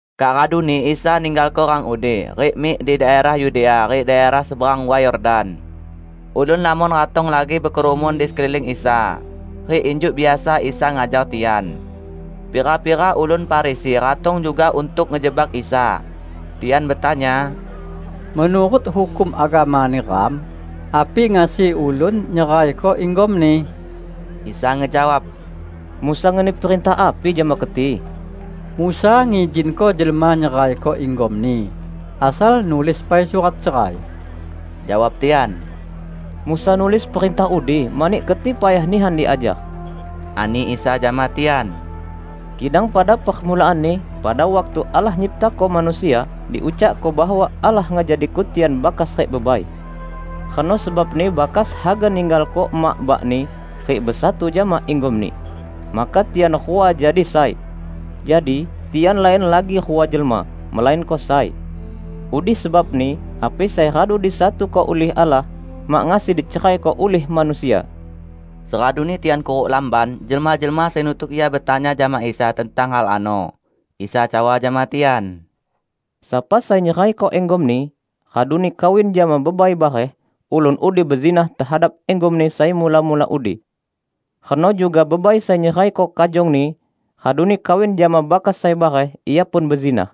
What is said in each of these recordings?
Kak raduni Isa ninggalko rang udi, rik mik di daerah Yudea rik daerah seberang Way Yordan. Ulun lamon ratong lagi bekerumun di sekeliling Isa. Rik injuk biasa Isa ngajar tian. Pira-pira ulun Farisi ratong juga untuk ngejebak Isa. Tian betanya, "Menurut hukum agama neram, api ngasi ulun nyeraiko inggomni?" Isa ngejawab, "Musa ngeni perintah api jama keti?" "Musa ngizinko jelma nyeraiko inggomni, asal nulis pai surat cerai," jawab tian. "Musa nulis perintah udi mani keti payah nihan diajar," ani Isa jama tian. "Kidang pada permulaanni, pada waktu Allah ngenyiptako manusia, diucakko bahwa 'Allah ngejadiko tian bakas rik bebai. Reno sebabni bakas haga ninggalko emak bakni rik besatu jama inggomni, maka tian rua jadi sai.' Jadi, tian lain lagi rua jelma, melainko sai. Udi sebabni, api sai radu disatuko ulih Allah, mak ngasi diceraiko ulih manusia!" Seraduni tian kuruk lamban, jelma-jelma sai nutuk Ia betanya jama Isa tentang hal ano. Isa cawa jama tian, "Sapa sai nyeraiko inggomni raduni kawin jama bebai bareh, ulun udi bezinah tehadap inggomni sai mula-mula udi. Reno juga bebai sai nyeraiko kajongni raduni kawin jama bakas sai bareh, ia pun bezinah."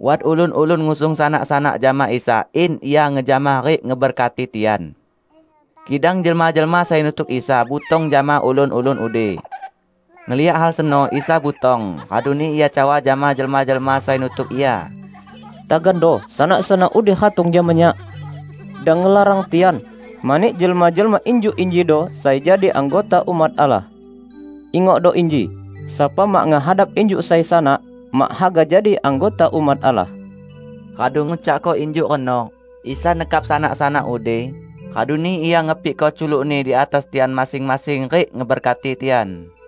Wat ulun-ulun ngusung sanak-sanak jama Isa in Ia ngejamah rik ngeberkati tian. Kidang jelma-jelma sai nutuk Isa butong jama ulun-ulun udi. Ngeliak hal seno, Isa butong raduni Ia cawa jama jelma-jelma sai nutuk Ia, "Tagando sanak-sanak udi ratong jama Nyak! Dang ngelarang tian, mani jelma-jelma injuk injido sai jadi anggota umat Allah. Ingokdo inji! Sapa mak ngehadap injuk sai sanak, mak haga jadi anggota umat Allah." Radu ngucakko injuk reno, Isa nekap sanak-sanak udi, raduni Ia ngepikko culuk-Ni di atas tian masing-masing rik ngeberkati tian.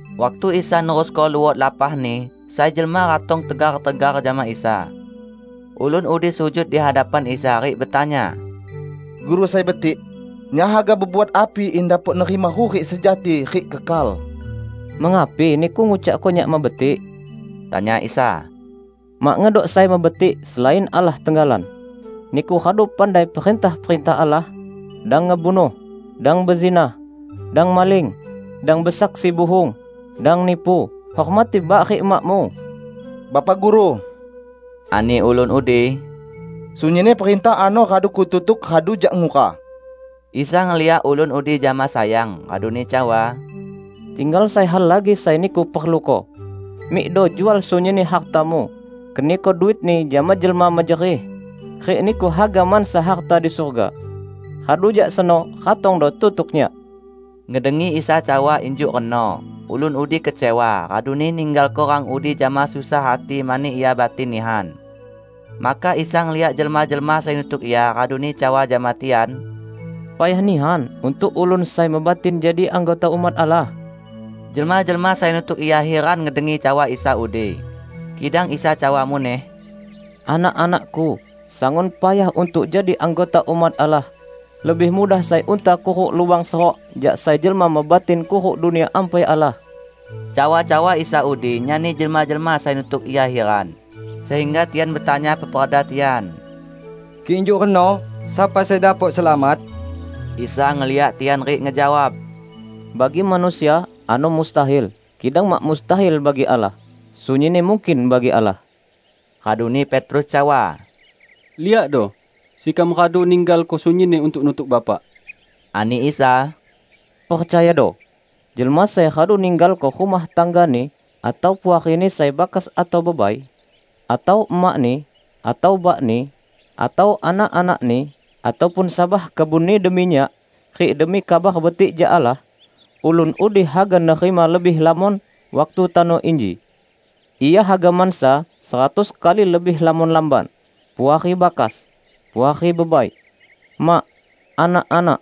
Waktu Isa nerusko luot lapah-Ni, sai jelma ratong tegar-tegar jama Isa. Ulun udi sujud di hadapan Isa rik betanya, "Guru sai betik, nyak haga bebuat api in dapok nerima hurik sejati rik kekal?" "Mengapi niku ngucakko Nyak mebetik?" tanya Isa. "Mak ngedok sai mebetik, selain Allah tenggalan. Niku radu pandai perintah-perintah Allah, 'Dang ngebunuh, dang bezinah, dang maling, dang besaksi buhung, dang nipu, hormati bak rik emakmu.' " "Bapak Guru," ani ulun udi, "sunyinni perintah ano radu kututuk radu jak ngura." Isa ngeliak ulun udi jama sayang raduni cawa, "Tinggal sai hal lagi sai niku perluko. Mikdo jual sunyinni hartamu; keniko duitni jama jelma mejerih, rik niku haga mansa harta di surga. Radu jak seno ratongdo tutuk Nyak." Ngedengi Isa cawa injuk reno, ulun udi kecewa, raduni ninggalko rang udi jama susah hati mani ia batin nihan. Maka Isa ngeliak jelma-jelma sai nutuk Ia raduni cawa jama tian, "Payah nihan untuk ulun sai mebatin jadi anggota umat Allah!" Jelma-jelma sai nutuk Ia hiran ngedengi cawa Isa udi. Kidang Isa cawa muneh, "Anak-anak-Ku, sangun payah untuk jadi anggota umat Allah! Lebih mudah sai unta kuruk lubang seruk jak sai jelma mebatin kuruk Dunia Ampai Allah." Cawa-cawa Isa udi nyani jelma-jelma sai nutuk Ia hiran, sehingga tian betanya peperda tian, "Kik injuk reno, sapa sai dapok selamat?" Isa ngeliak tian rik ngejawab, "Bagi manusia ano mustahil, kidang mak mustahil bagi Allah; sunyinni mungkin bagi Allah." Raduni Petrus cawa, "Liakdo, sekam radu ninggalko sunyinni untuk nutuk Bapak." Ani Isa, "Percayado: jelma sai radu ninggalko rumah tanggani, atau puarini sai bakas atau bebai, atau emakni, atau bakni, atau anak-anakni, ataupun sabah kebunni demi Nyak rik demi Kabar Betik jak Allah, ulun udi haga nerima lebih lamon waktu tano inji. Ia haga mansa seratus kali lebih lamon lamban, puari bakas, puari bebai, mak, anak-anak,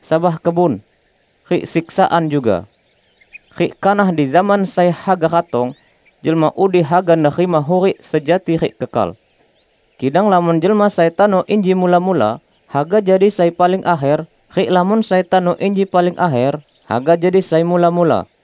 sabah kebun, -- rik siksaan juga. Rik kanah di zaman sai haga ratong, jelma udi haga nerima hurik sejati rik kekal. Kidang lamon jelma sai tano inji mula-mula haga jadi sai paling akher rik lamon sai tano inji paling akher haga jadi sai mula-mula."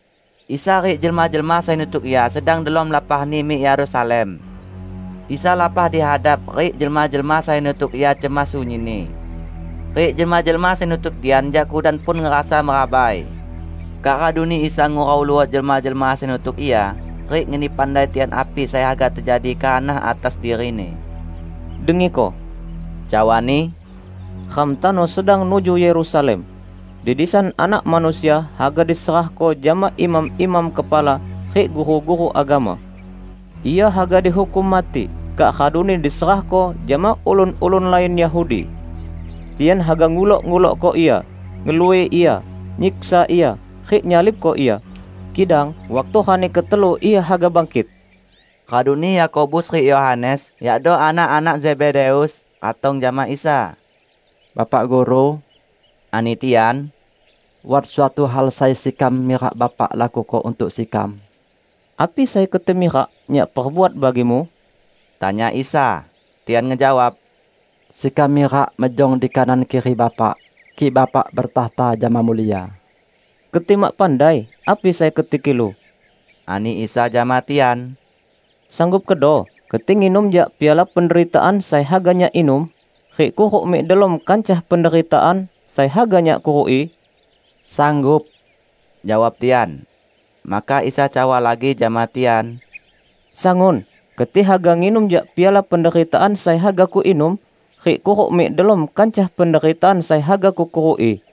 Isa rik jelma-jelma sai nutuk Ia sedang delom lapahni mik Yerusalem. Isa lapah di hadap, rik jelma-jelma sai nutuk Ia cemas sunyinni. Rik jelma-jelma sai nutuk tian jak kudan pun ngerasa merabai. Kak raduni Isa ngurau luot jelma-jelma sai nutuk Ia rik ngeni pandai tian api sai haga tejadi kanah atas diri-Ni. "Dengiko," cawa-Ni, "ram tano sedang nuju Yerusalem. Di disan Anak Manusia haga diserahko jama imam-imam kepala rik guru-guru agama. Ia haga dihukum mati, kak raduni diserahko jama ulun-ulun lain Yahudi. Tian haga ngulok-ngulokko Ia, ngelui Ia, nyiksa Ia, rik nyalibko Ia. Kidang waktu rani ketelu Ia haga bangkit." Raduni Yakobus rik Yohanes, yakdo anak-anak Zebedeus, ratong jama Isa. "Bapak Guru," ani tian, "wat suatu hal sai sekam mirak Bapak lakuko untuk sekam." "Api sai keti mirak Nyak perbuat bagimu?" tanya Isa. Tian ngejawab, "Sekam mirak mejong di kanan kiri Bapak, kik Bapak bertakhta jama mulia." "Keti mak pandai api sai keti kilu," ani Isa jama tian, "Sanggup kedo keti nginum jak piala penderitaan sai haga Nyak inum rik kuruk mik delom kancah penderitaan sai haga Nyak kuruki?" "Sanggup," jawab tian. Maka Isa cawa lagi jama tian, "Sangun keti haga nginum jak piala penderitaan sai haga Kuinum, rik kuruk mik delom kancah penderitaan sai haga Kukuruki.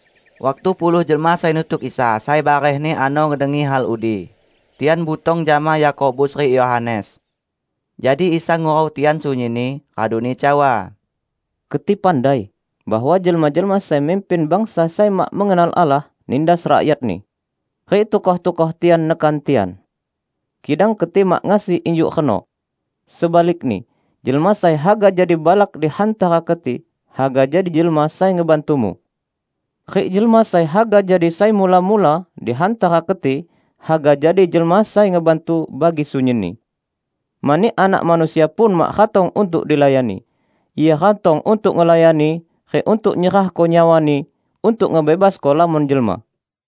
Waktu puluh jelma sai nutuk Isa sai barehni ano ngedengi hal udi, tian butong jama Yakobus rik Yohanes. Jadi Isa ngurau tian sunyinni, raduni cawa, "Keti pandai bahwa jelma-jelma sai mimpin bangsa sai mak mengenal Allah nindas rakyatni. Rik tukoh-tukoh tian nekan tian. Kidang keti mak ngasi injuk reno! Sebalikni, jelma sai haga jadi balak di hantara keti, haga jadi jelma sai ngebantumu. Rik jelma sai haga jadi sai mula-mula di hantara keti, haga jadi jelma sai ngebantu bagi sunyinni. Mani Anak Manusia pun mak ratong untuk dilayani. Ia ratong untuk ngelayani rik untuk nyerahko nyawa-Ni untuk ngebebasko lamon jelma."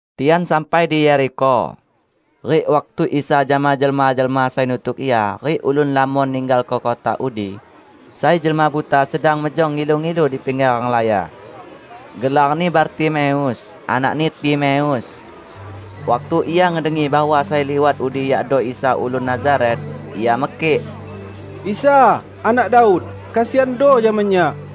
Tian sampai di Yerikho. Rik waktu Isa jama jelma-jelma sai nutuk Ia rik ulun lamon ninggalko kota udi, sai jelma buta sedang mejong ngilu-ngilu di pingger renglaya. Gelarni Bartimeus, anakni Timeus. Waktu ia ngedengi bahwa sai liwat udi yakdo Isa ulun Nazaret, ia mekik, "Isa, Anak Daud! Kesiando jama nyak!"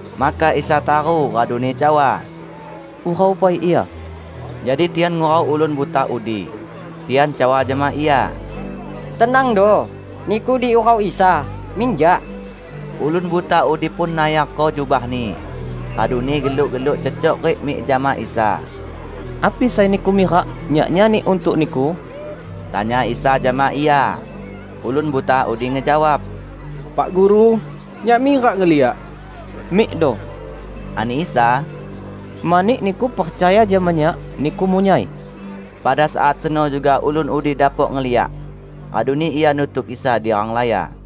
Maka Isa taru raduni cawa, "Urau pai ia." Jadi tian ngurau ulun buta udi. Tian cawa jama ia, "Tenangdo! Niku diurau Isa, minjak!" Ulun buta udi pun nayarko jubahni, raduni geluk-geluk cecok rik mik jama Isa. "Api sai niku mirak Nyak nyani untuk niku?" tanya Isa jama ia. Ulun buta udi ngejawab, "Pak Guru, nyak mirak ngeliak." "Mikdo," ani Isa, "mani niku percaya jama Nyak, niku munyai." Pada saat seno juga ulun udi dapok ngeliak. Raduni ia nutuk Isa di renglaya.